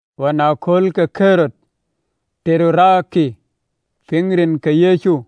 Ɣɔn ë aköölkë, ke Ɣerod bɛ̈ny ë piŋ rin ke Yecu,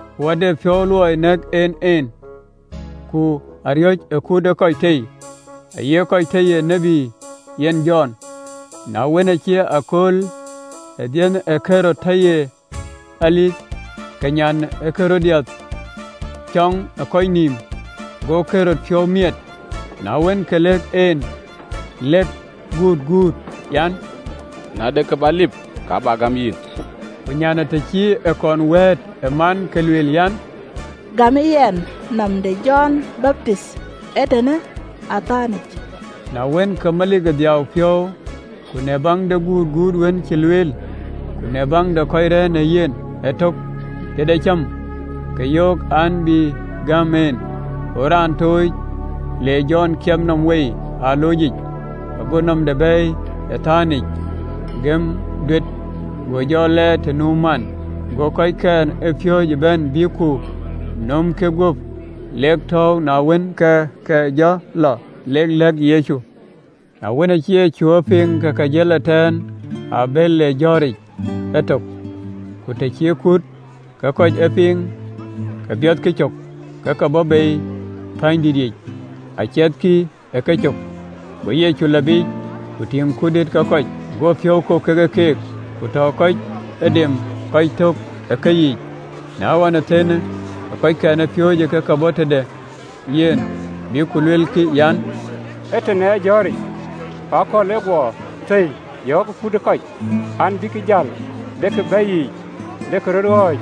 Ku aa de piɔ̈u luɔi nɛ̈k en en, ku aa riɔ̈c ë kut ë kɔc tei, aye kɔc tɔ ye tiët yen Jɔn. Na wën, acï akööl ë dhiëëthë Ɣerod tɔ ye aliith, ke nyan ë Ɣerodiath cɔ̈ŋ ë kɔc nïïm, go Ɣerod piɔ̈u miɛt. Na wën, ke lëk en lëk gutguut an, “Na de kë bä lip, ka bä gam yïn!” Ku nyanë, të cï ë kɔn wɛ̈ɛ̈t ë man, ke lueel an, “Gämë yɛn nɔm de Jɔn Baptith ee tënë ë atɛ̈nyic!” Na wën, ke melik dhiau piɔ̈u, ku në baŋ de gutguut wën cï lueel, ku në baŋ de kɔc rɛ̈ɛ̈r ë yen ëtök tëde cäm, ke yöök, an, bï gam en. Go raan tooc, an le Jɔn kiɛp nɔm wei ë aloocic. Go nɔmde bɛ̈ɛ̈i atɛ̈nyic, gɛ̈më duet, go jɔ lɛɛr të nu man. Go kɔckɛn ë piööcë bɛ̈n, bïk ku nömkï guöp, lek tɔ̈ɔ̈u, na wën, ke ke jɔ lɔ lek lɛ̈k Yecu. Na wën, acï Yecu ë piŋ ke jël ëtɛ̈ɛ̈n ë abël, le ë jɔ̈ɔ̈ric ëtök, ku të cï kuut ke kɔc ë piŋ, ke biɔthkï cök, ke ke bɔ̈ bei ë wuötiic aciɛthkï ë kecök. Go Yecu lɔ biic, ku tïŋ kut dïït ë kɔc, ago piɔ̈u kok ke keek, ku tɔ kɔc dem kɔc tök ë keyiic. Na ɣɔn thëën, ke kɔckɛn ë piööcë ë ke bɔ̈ tëde yen, bïk ku luelkï, an, “Ëtënë ee jɔ̈ɔ̈ric, ku akɔ̈l ë guɔ thëi, yɔ̈ɔ̈kë kut ë kɔc, an, bïk jäl, lek ë bɛ̈i yiic, lek rö ɣɔ̈c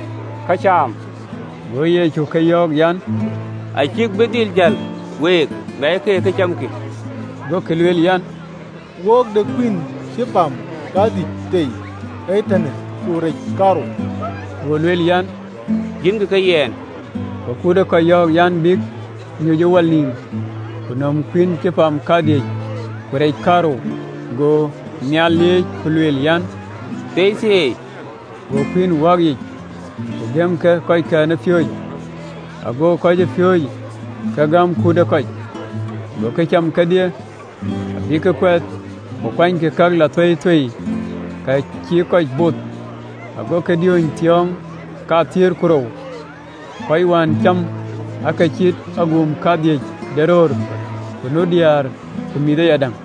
këcam.” Go Yecu ke yöök an, “Acïkï bï dhil jäl, week, miackï keek ë këcamkï.” Gokï lueel an, “Wok de kuïïn cï pam kadhïc tei ee tënë, ku rec kaarou.” Go lueel an, “Yiënkï ke yɛn.” Go kut ë kɔc yɔ̈ɔ̈k an, “Bïk nyuc ë wal nïïm, ku nöm kuïïn cï pam kadhïc, ku rec kaarou, go nhial lieec, ku lueel, an, “Thieithieei, go kuïïn wääk yiic, ku gëm ke kɔcpiööcë, go kɔcpiööcë ke gäm kut ë kɔc. Gokï cam kedhie, abïk kuɛth. Ku kuanykï ka lɔ thueithuei, ka cï kɔc both, agokï diööny thiɔ̈ɔ̈ŋ kathiëër ku rou. Kɔc wën cäm aake cït agum kadhïny de röör, ku nu diäär ku mïth ayadäŋ.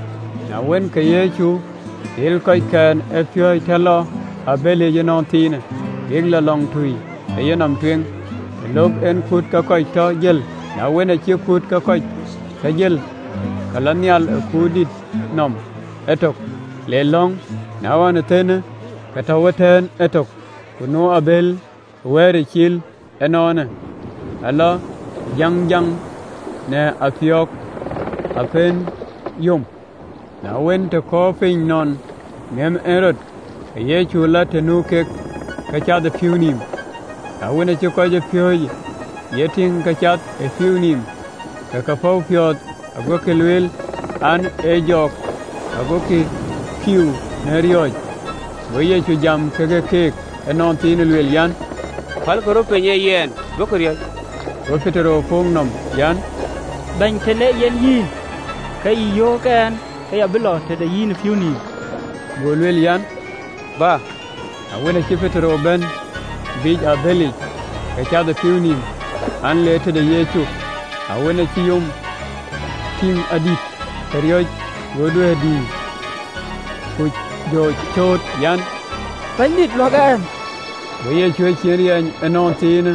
Na wën, ke Yecu dhil kɔckɛn ë piööcë tɔ lɔ ë abëlic ënɔnthiinë, bïk lɔ lɔŋtui ë yenɔm tueŋ, të löök en kuut ke kɔc tɔ jël. Na wën, acï kuut ke kɔc tɔ jël, ke lɔ nhial ë kuurdït nɔm ëtök, le lɔ̈ŋ. Na ɣɔn thëën, ke tɔ̈u ëtɛ̈ɛ̈n ëtök. Ku nu abël ë wɛ̈ɛ̈ric cil ënɔɔnë, ë lɔ jäŋjäŋ në apiöök, apëën yom. Na wën, të kɔɔrë piny nɔn ŋeep en rɔt, ke Yecu lɔ të nu keek ke cath ë pïïu nïïm. Na wën, acï kɔcpiööcë ye tïŋ ke cath ë pïïu nïïm, ke ke päu piɔ̈ɔ̈th, agokï lueel, an, “Ee jɔk,” agokï kiu në riɔ̈ɔ̈c. Go Yecu jam ke keek ënɔnthiinë, lueel an, “Pälkï röt piny, ee yɛn, duökï riɔ̈c!” Go Petero puk nɔm an, “Bɛ̈ny, tën ee yen yïn, ke yï yöök ɛn ke ya bï lɔ tëde yïn ë pïïu nïïm.” Go lueel an, “Bä. Na wën, acï Petero bɛ̈n biic ë abëlic, ke cath ë pïïu nïïm, an, le tëde Yecu. Na wën, acï yom tïŋ adït, ke riɔ̈c, go duɛ̈ɛ̈r dïïr, ku jɔ cööt, an, “Bɛ̈nydït, luäk ɛn.” Go Yecu ecin riny ënɔnthiinë,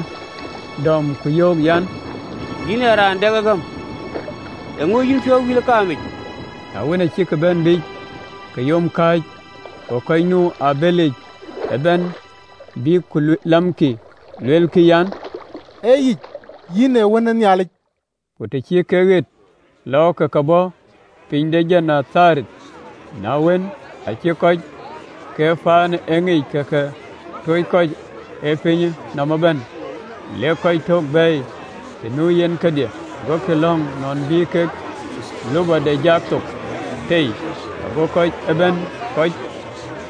dɔm, ku yöök an, “Yïn ee raan dɛk ë gäm, eeŋö ë yïn piɔ̈u wïl ë kaamic?” Na wën, acïk bɛ̈n abëlic, ke yom kääc. Go kɔc nu ë abëlic bɛ̈n bïk ku lamkï, luelkï an, “Ee yic, yïn ee Wën ë Nhialic.” Ku të cï kek ɣet lɔɔk, ke ke bɔ̈ piny de Genetharet. Na wën, acï kɔc ke paanë e ŋic, ke ke tooc kɔc ë pinyë nɔm ëbɛ̈n, lek kɔc tök bɛ̈ɛ̈i të nu yen kedhie, agokï lɔ̈ŋ nɔn bï kek lupɔde jak thok tei, go kɔc ëbɛ̈n kɔc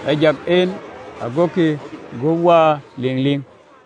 ë jak en agokï gup waar ëliŋliŋ.